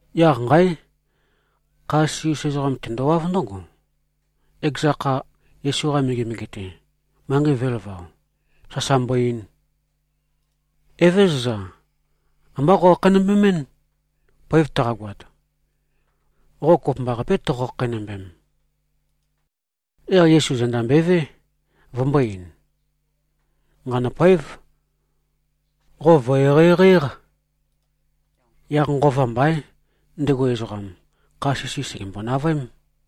Yaq nqáe! Kha sisi-us ezoqam tendowáv ndǿgo, ekeza kha, Yesu-qa megemege-te, manqei vø̄elavao, sasa mbo-ein, “Evézøza. Ambá qokhakheinømbemín. Poev taqagoat, qo kopømbaqapé, toqo-khakheinømbem.” Yaq Yesu zenda mbøevé, vømbō-ein, “Nqanø̂poév. Qo vø̀-eqeieqei-éq.” Yaq nqova mbaín, ndego ezoqam, kha sisi sègembo-navøém.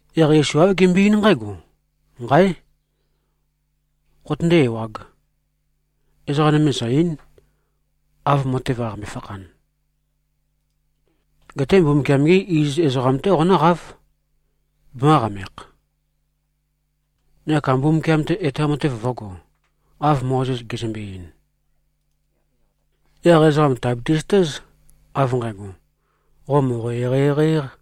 Yaq Yesu āv gembøe-eín nqǽgo, “Nqáe! Qotøndé-ewāg. Ezoqa nøme zø̀-ei᷄n, av matev qaqambe-fakhan. Geté Mbumbukiam-gé iziz ezoqam-té qonǿqáv, bemø̄qamekh, neka Mbumbukiam-te etoam matev vø̄go, av Mozes gezømbe-ein. Yaq ezoqa tìabiti-zøtéz, av nqægo, qo mòqo-eqeieqei-éq.”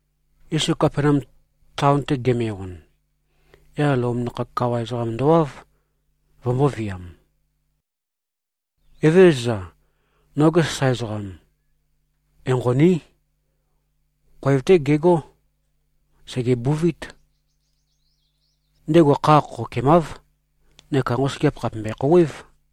Yesu Kapenaum taon-te geme-on, yaq Lom nakhag kawa ezoqam ndowáv, vømbōviam, “Evézøza, noge sasae ezoqam enqoní. Khoev-té gegó. Sègebuvít. Ndego kha khokhokemáv, neka nqosøgeap khàpe mbøe-khouwév.”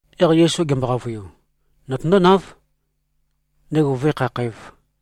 Yaq Yesu gembo-qavøiu, “Notøndónáv, ndego vǿe-khakhǣv.”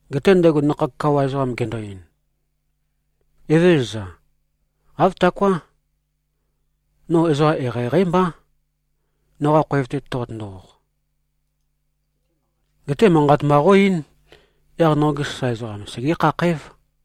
Geté ndego nakhag kawa ezoqam gendo-ein, “Evézøza. Āv taoká. No ezoqa eqeieqeí mbá, noqa khoev-te toqotøndo-oq. Geté manqat mba qó-eín, yaq noge sasae ezoqam segé-khakhǽv.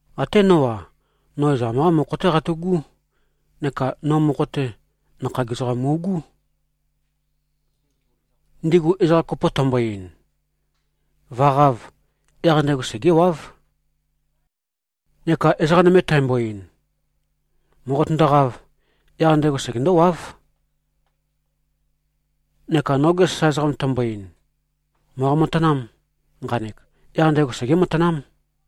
Até nó-a, no ezoqam-qá mokho-té qatu꞉gú. Neka no mokho-te, nakhag ezoqam mu꞉gú. Ndigu ezoqa kopo tæmbo-ein, ‘Vø̀qāv’, yaq ndego segéwáv. Neka ezoqa nøme tæmbo-ein, ‘Mòqotøndoqāv’, yaq ndego segendówáv. Neka noge sasae ezoqam tæmbo-ein, ‘Mòqo-matanām, nqanek’, yaq ndego segé-matanám.”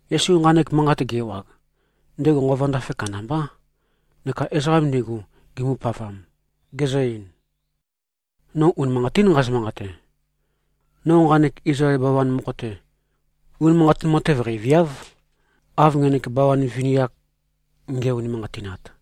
Yesu nqanek manqat ge-ewag, ndego nqova ndafe kandambá, neka ezoqam ndigu gimbopavam, gezø-ein, “No unimanqatín nqazø-manqate. No nqanek Izlael bawan mokho-te, unimanqatin matev qeiviáv, av ngenek bawan vini-ak nge꞉-unimanqatinat.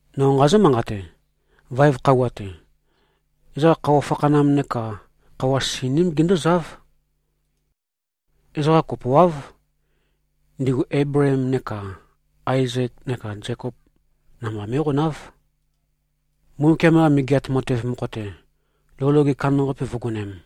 No nqazǿ-manqate: Vaev khøuwa-te, ezoqa khøuwa fakhanam neka khøuwa sininím gindúzáv. Ezoqa kopoáv. Ndigu Eibleem neka Aezek neka Zekop namba mé꞉qonáv, Mbumbukiam-qa Megeat Matev mokho-te, lou loge kandambaqape vǿgonēm.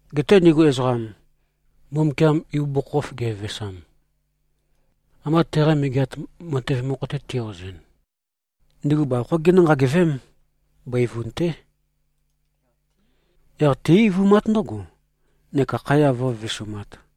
Geté ndigu ezoqam, Mbumbukiam ibugukhokhof gevevesam, ambā teqa Megeat Matev mokho-te ti-ozɨn, ndigu bavokhó ginǿ-nqagevém. Bøivun-té. Yaq tí-eivumát ndǿgo, neka khaya vǿvivisumāt.”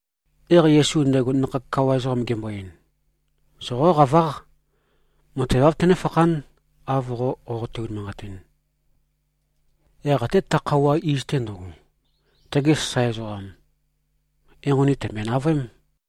Yaq Yesu ndego nakhag kawa ezoqam gembo-ein, “Soqóqaváq. Matev āv tønéfakhán, av qo qoqote-unimanqatin.” Yaq até ta khøuwa iz-te ndøgo, tege sasae ezoqam enqoni tø̀mbøe-navøém.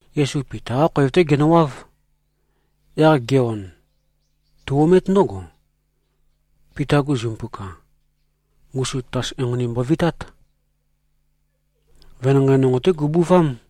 Yesu Pita-qá khoev-té genøwáv. Yaq ge-on, tu-omét ndǿgo, Pita-gu zimpuka, ngusu tatas enqoni mbovitát. Venanqei nonqo-té gubuvám.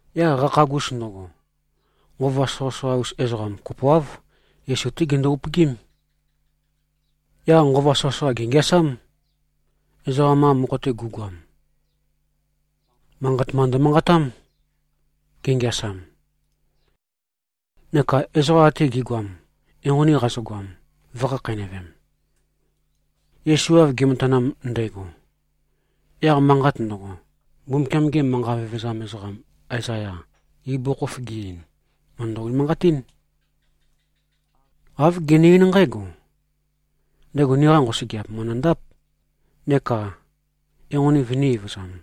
Yaq qakhagus ndøgo, nqova soqøsoqa-us ezoqam kopoáv, Yesu-té gindu-upøgím. Yaq nqova soqøsoqa gèngeasám, ezoqam-qa mokho-te gu꞉goam. Manqat mba ndømanqatám, gengeasam. Neka ezoqa ate gi꞉goam, enqoni qazøgoam, vø̄khakheinøvem. Yesu av ge꞉matanam ndægo, yaq manqat ndøgo, Mbumbukiam-ge manqa vevezam ezoqam Aezaya ibugukhokhof ge-ein, mø̀ndø-unimanqatín. Āv gene-eín nqǽgo, “Ndego niqa nqosøgeap mø̀ndøndáp neka enqoni vønī-evøzam.”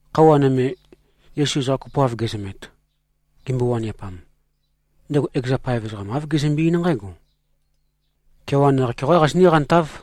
Khøuwa nøme, Yesu ezoqa kopoav gezømet, gimbo-waniapam, ndego ekeza paev ezoqam āv gezømbe-eín nqǽgo, “Kewan yaq-keoqá qazinǿ-qantáv.”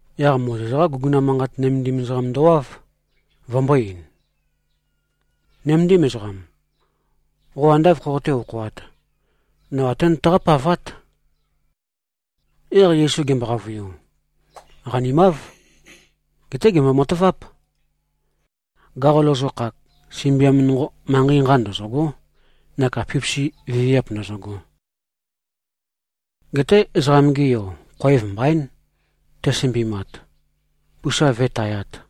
Yaq Mozes-qá guguna manqat nømendim ezoqam ndowáv, vømbō-ein, “Nøméndim ezoqam. Qo ande āv khoqoté-okhoāt, no até nøtaqá-pavát.” Yaq Yesu gembo-qavøiu, “Qanimáv. Geté gèmbo-mataváp. Gaqo lozokhak, sømbiam nonqo, manqei nqa ndøzø̂gó neka pipisi viviap ndø̄zø̄gō. Geté Ezoqam-ge Yo khoev mbaín, te꞉sømbimat, pusa vǿe-tayāt.”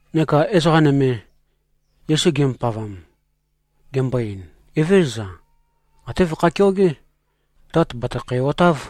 Neka ezoqa nøme, Yesu gimbopavam, gendo-ein, “Evézøza. Até vøkhæ-keogé. Tat bàtøkhæ-otáv.”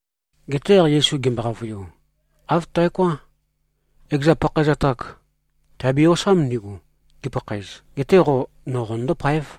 Geté yaq Yesu gembo-qavøiu, “Āv taoká. Ekeza pakhaezat-ak tiabe-osám ndigu, gipakhaez. Geté qo, no qonøndó-páev.”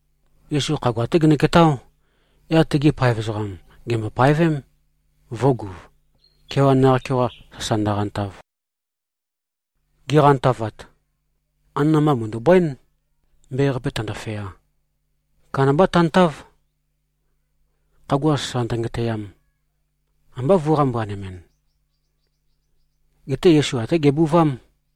Yesu khagua-té genøketáo. Yaq tegi paev ezoqam gèmbo-paevém, vø̄guv, kewan yaq-keoqa sasa ndøqantav. Giqantavat, anana-mba mø̀ndu꞉bǿen, mbe-qape tāndōfeā. Kandamba tantáv, khagua sasa ndøngetøyam, ambá vø̄-qambuanemɨn. Geté Yesu até gebuvám.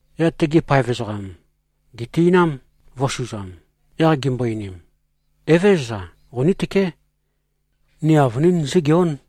Yaq tegi paev ezoqam, gèti꞉nám, vø̄suzam. Yaq gimbo-einim, “Evézøza. Qonítøké. Ni avønín zígeón.”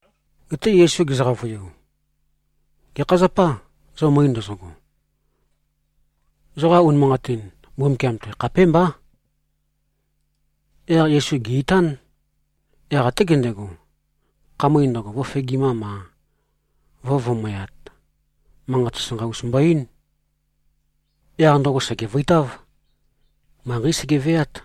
Geté Yesu gezø-qavøiu, “Gekha zapâ, zo møe ndozogo? Zoqa unimanqatin Mbumbukiam-te khapémbá.” Yaq Yesu gè-itán. Yaq até gendego, khamøe ndøgo, vø̄fegimam-a, vø̄vumøyat, manqat sasanqa-us mbo-eín. Yaq ndøgo sègevøitáv. Manqeí sege꞉veát.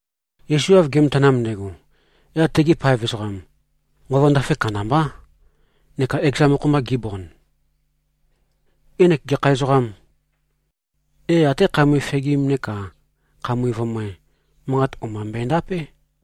Yesu av ge꞉matanam ndægo, yaq tegi paev ezoqam nqova ndafe kandambá, neka ekeza mokho-mba gibond, “Ngenek gekha ezoqâm? É, até khamøe fegim neka khamøe vumøe, manqat o-mba mbøendapé.”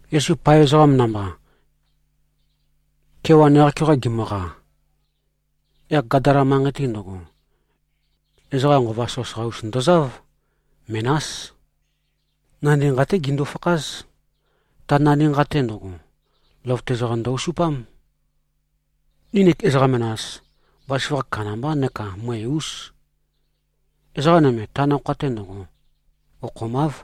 Yesu paev ezoqam namba, kewan yaq-keoqa gimøqa, yaq Gadala manqei-te ndøgo, ezoqa nqova soqøsoqa-us ndozáv. Menás. Nandi nqa-té gindu-fakház. Ta nandi nqa-te ndøgo, løvøte ezoqam ndø-osupám. Nginik ezoqa menas, bazaføgakh kandambá neka møe-ús. Ezoqa nøme ta nakhoa-te ndøgo okhomáv.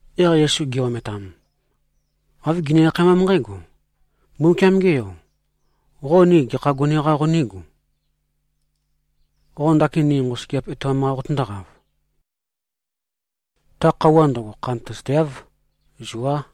Yaq Yesu gi-ometam, āv gini-akhaemám nqǽgo, “Mbúmbukiam-ge Yo! Qo ni gekha gone-qa qonígu? Qo ndakin ni nqosøgeap etoam-qa qotøndóqav? Ta khøuwa ndøgo khantøzateáv. Zuá!”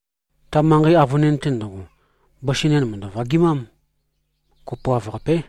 Ta manqei avønin-te ndøgo, bøsi nen mø̀ndø-vagimám. Kopoav-qapé.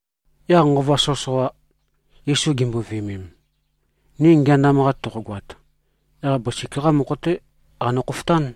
Yaq nqova soqøsoqa, Yesu gimbo-viømem, “Ni ngeandam-qa toqogoat, yaq bøsik-qá mokho-té qanø-khofotán.”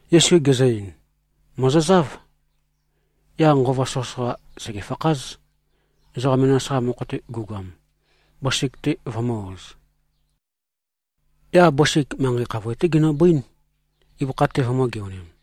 Yesu gezø-ein, “Mòzozáv.” Yaq nqova soqøsoqa, sègefakház, ezoqa menas-qa mokho-te gu꞉goam, bøsik-te vømø̄-oz. Yaq bøsik manqei khavoe-té ginøbøín, ibøkha-te vømø̄-geonim.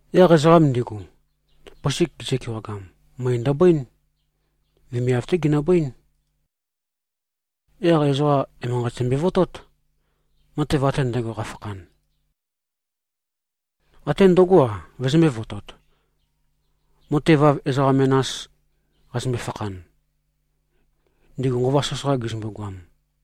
Yaq ezoqam ndigu, bøsik gizø-kewagam, møe ndøbøín. Vemiav-té ginøbøín. Yaq ezoqa emanqat zømbe-votót, matev ate ndægo, qafakhan. Até ndøgó-a, vøzømbē-votot, matev av ezoqa menas qazømbe-fakhan, ndigu nqova soqøsoqa gizømbu-goam.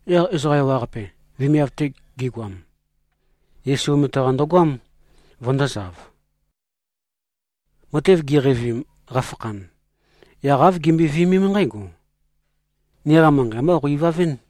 Yaq ezoqa ewaqape, vemiav-te gigoam, Yesu omete-qa ndøgoám, vøndōzav. Matev giqeivim, qafakhan, yaq āv gimbøe-viømém nqǽgo, “Niqa manqei ambá qo-ivavɨ́n.”